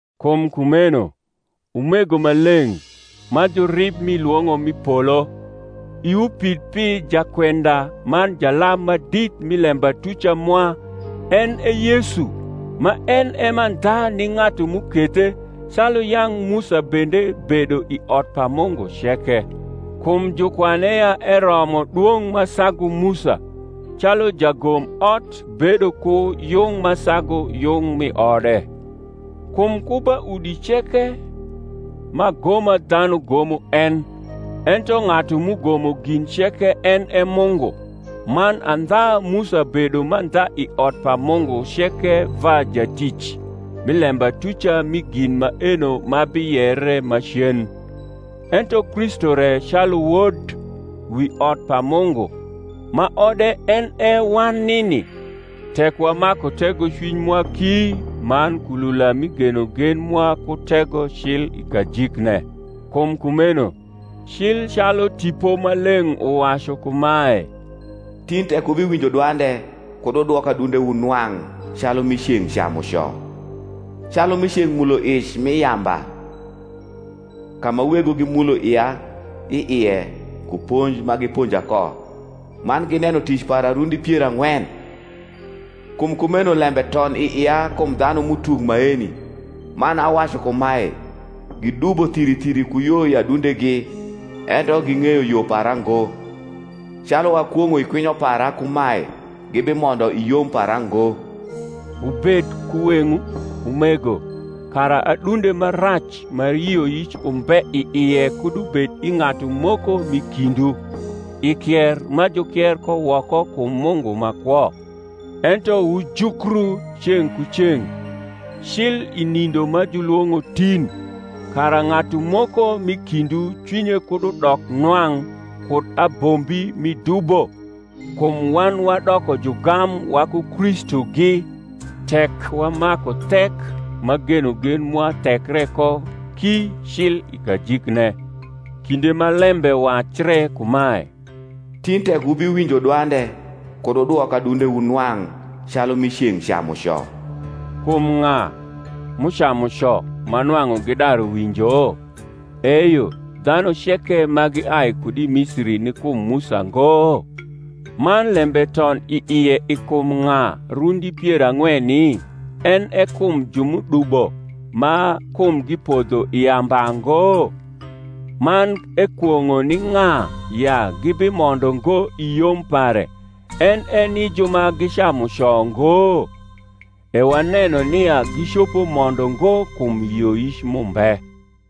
Kum kumeno, umego ma leng’, ma jurib mi lwong’o m’i polo, iwu pid pi Jakwenda man Jalam Madit mi lembatuca mwa, en e Yesu: ma en e mandha ni ng’atu m’ukethe, calu yang’ Musa bende bedo i ot pa Mungu ceke. Kum jukwane ya eromo dwong’ ma sagu Musa, calu jagomot bedo ku yung ma sagu yung mi ode. Kum ku ba udi ceke m’agoma dhanu gomo en: ento ng’atu m’ugomo gin ceke en e Mungu. Man andha Musa bedo mandha i ot pa Mungu ceke va jatic, mi lembatuca mi gin maeno ma biyere macen; ento Kristu re calu wod, wi ot pa Mungu; ma ode en e wan nini, tek wamaku tegocwiny mwa ki man kulula mi genogen mwa ku tego cil i kajikne. Kum kumeno, cil calu Tipo Maleng’ uwacu kumae, Tin tek wubiwinjo dwande, Kud wudwok adundewu nwang’, calu m’i ceng’ camuco, Calu m’i ceng’ muloic m’i yamba. Ka ma wegwu gimulo ia i ie ku ponj ma giponja ko, Man gineno tic para rundi pier ang’wen, Kum kumeno lembe ton i ia kum dhanum’utuk maeni, Man awacu kumae, Gidubo thiri thiri ku yo i adundegi: Ento ging’eyo yo para ngo; Calu akwong’o i kwinyo para kumae, Gibimondo i yom para ngo. Wubed ku weng’wu, umego, kara adunde ma rac ma yioyic umbe i ie kud ubed i ng’atu moko mi kindwu, i kier ma jukier ko woko kum Mungu ma kwo: ento wujukru ceng’ ku ceng’, cil i nindo ma julwong’o Tin; kara ng’atu moko m’i kindwu cwinye kud udok nwang’ kud abombi mi dubo: kum wan wadoko jugam waku Kristugi, tek wamaku thek ma genogen mwa thekre ko ki cil i kajikne: kinde ma lembe wacre kumae, Tin tek wubiwinjo dwande, Kud wudwok adundewu nwang’, calu m’i ceng’ camuco. Kum ng’a, m’ucamu co ma nwang’u gidaru winjo? eyo, dhanu ceke ma giai kud i Misiri ni kum Musa ngo? Man lembe ton i ie i kum ng’a rundi pier ang’weni? en e kum ju m’udubo, ma kumgi podho i yamba ngo? Man ekwong’o ni ng’a ya gibimondo ngo i yom pare, en e ni ju ma gicamu co ngo? E waneno nia gicopo mondo ngo kum yioyic m’umbe.